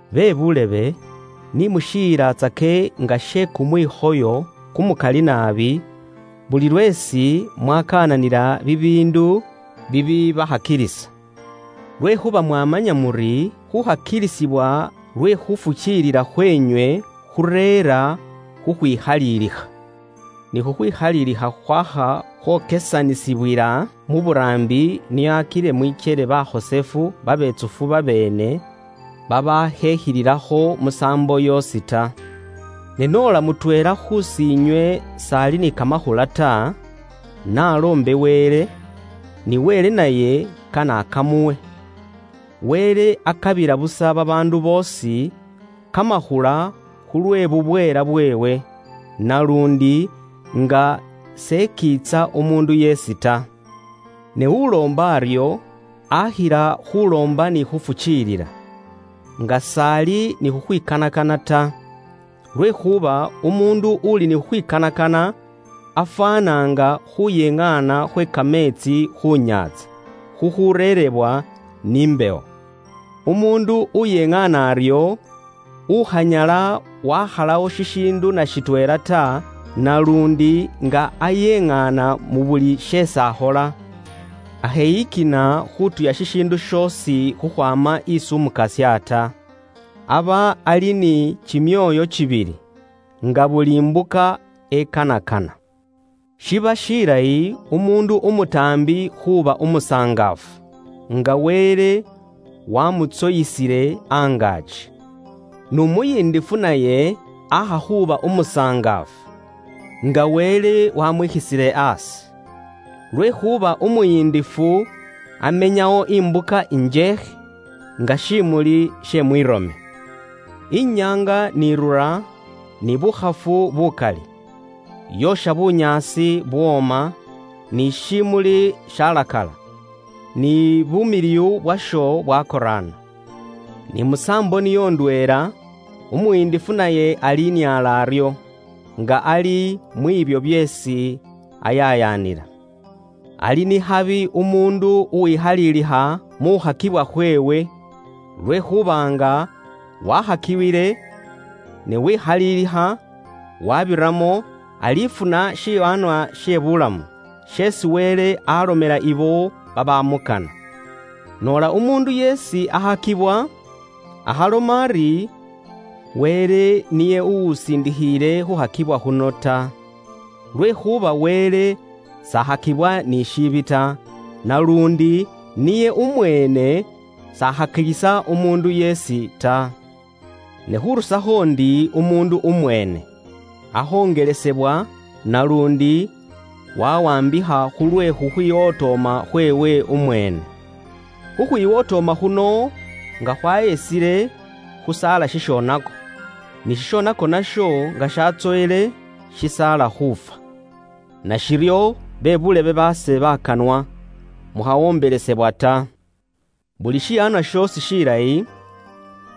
Bebuulebe, ni mushiyilatsake nga she kumwikhoyo kumukali naabi, buli lweesi mwakaananila bibiindu bibibakhakilisa, lwekhuuba mwamanya muri, khukhakilisibwa lwe khufukiilila khweenywe khureera khukhwikhalilikha. Ni khukhwikhalilikha khwakha khwokesanisibwila mu buraambi, nio akile mwikyele bakhosefu babetsufu babeene, babaakhekhililakho musaambo yoosi ta. Ne noola mutweela khusiinywe s'ali ni kamakhula ta, n'aloombe Wele, ni Wele naye kane akamuwe. Wele akabila busa babaandu boosi kamakhula khulwe bubweela bweewe, naluundi nga s'ekiitsa umuundu yeesi ta. Ne uloomba aryo, akhila khuloomba ni khufukiilila, nga s'ali ni khukhwikanakana ta. Lwekhuuba umuundu uli ni khukhwikanakana afwaana nga khuyeŋaana khwe kameetsi khu nyaantsa, khukhureerebwa ni mbewo. Umuundu uyeŋaana aryo, ukhanyala wakhalawo shishiindu na shitweela ta, naluundi nga ayeŋaana mu buli sheesi akhola, akheyikina khutuya shishiindu shoosi khukhwaama isi Umukasya ta. Aba ali ni kimyoyo kibili, nga buli mbuka ekanakana. Shiba shilayi uwe buulebe umutaambi khuuba umusangaafu, nga Wele wamuniinisile angaaki. N'umuyindifu naye aakha khuuba umusangaafu, nga Wele waamwikhisile aasi. Lwekhuuba umuyindifu amenyawo imbuka njeekhe, nga shiimuli she mwiirome. Inyaanga n'irura, ni bukhafu bukali, yoosha bunyaasi bwooma, ni shiimuli shalakala, ni bumiliwu bwasho bwakoraana. Ni musaambo niyo ndweela, umuyindifu naye aliniala aryo, nga ali mwiibyo byeesi ayayaanila. Ali ni khabi umuundu uwikhalilikha mu khukhakibwa khweewe, lwekhuuba nga wakhakiwile, ne wekhalilikha wabiramo, alifuna shiwaanwa she buulamu, sheesi Wele alomela ibo babamukana. Noola umuundu yeesi akhakibwa, akhaloma ari, “Wele niye uwusindikhiile khukhakibwa khuno” ta. Lwekhuuba Wele s'akhakibwa ni shiibi ta, naluundi niye umweene s'akhakilisa umuundu yeesi ta. Ne khurusakho ndi umuundu umweene, akhongelesebwa naluundi wawaambikha khulwe khukhwiwotooma khweewe umweene. Khukhwiwotooma khuno nga khwahesile, khusaala shishonako; ni shishonako nasho nga shatsoyile, shisaala khuufwa. Nashiryo, be buulebe baase bakanwa, mukhawombelesebwa ta. Buli shiwaanwa shoosi shilayi,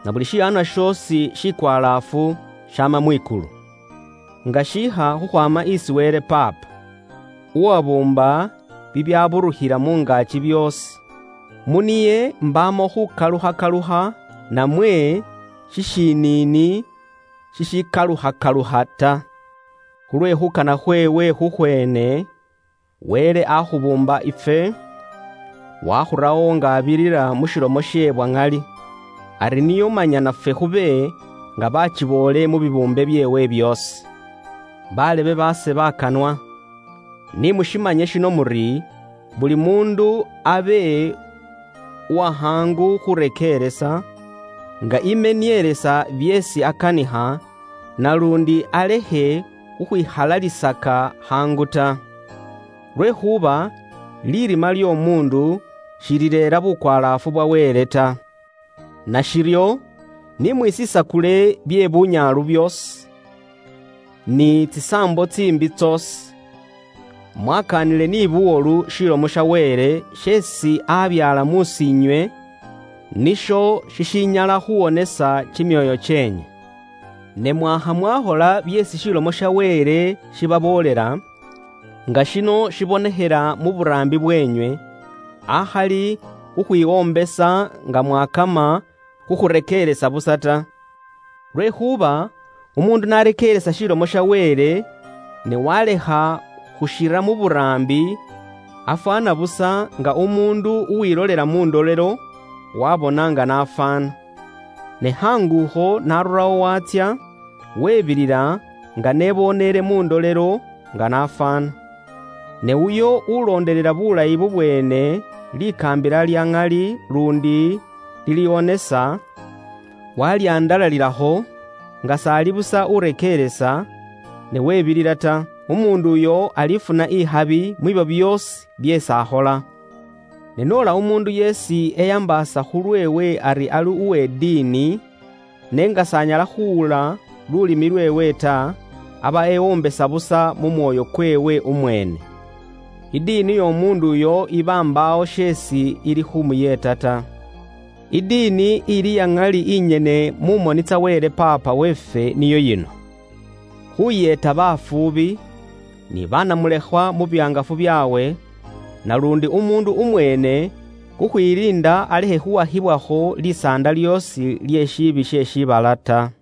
nabuli shiwaanwa shoosi shikwalaafu, shaama mwikulu, nga shiikha khukhwaama isi Wele Paapa, uwabuumba bibyaburukhila mu ngaaki byoosi. Mu niye imbaamo khukalukhakalukha namwe shishiniini shishikalukhakalukha ta. Khulwe khuukana khweewe khukhweene, Wele akhubuumba ifwe, wakhurawo nga abirira mu shilomo she bwa ŋali, ari nio manya nafwe khube nga baakiboole mu bibuumbe byeewe byoosi. Be buulebe baase bakanwa, ni mumanye shino muri, buli muundu abe uwakhaangu khurekeeresa, nga emenielesa byeesi akanikha naluundi alekhe khukhwikhalalisaka khaangu ta. Lwekhuuba lirima ly'omuundu shilireera bukwalaafu bwa Wele ta. Nashiryo, ni mwisisakule bye bunyaalu byoosi, ni tsisaambo tsiimbi tsoosi, mwakaanile ni buwolu Ilomo ya Wele isi aabyaala mus'iinywe, nisho shishinyala khuuwonesa kimyoyo kyeenywe. Ne mwaakha mwaakhola byeesi Ilomo ya Wele ibaboolela, nga shino shibonekhela mu buraambi bweenywe, akhali khukhwiwombesa nga mwaakama khu khurekeeresa busa ta. Lwekhuuba umuundu n'arekeeresa Ilomo ya Wele, ne walekha khukira mu buraambi, afwaana busa nga umuundu uwilolela mu ndolelo, waabona nga n'afwaana. Ne khaangu akho n'arurawo waatsya, webilila nga n'eboneele mu ndolelo, nga n'afwaana. Ne uyo ulondelela buulayi bubweene likaambila lya ŋali luundi liliwonesa, walihandalalilakho, nga s'ali busa urekeeresa, ne webilila ta; umuundu uyo alifuna ikhabi mwibyo byoosi byeesi akhola. Ne noola umuundu yeesi eyambaasa khulweewe ari ali uwe diini, n'enga s'anyala khuwula lulimi lweewe ta, aba ewombesa busa mu mwoyo kweewe umweene. Idiini y'omuundu uyo iba mbaawo sheesi ilikhumuyeeta ta. Idiini ili iya ŋali naluundi ikhalikho likoondo mu moni tsa Wele Paapa weefwe niyo yino: khuyeeta bafuubi, ni banamulekhwa mu bihangafu byaabwe, naluundi umuundu umweene khukhwiliinda alekhe khuwakhibwakho lisaanda lyoosi lye shiibi she mu shiibala ta.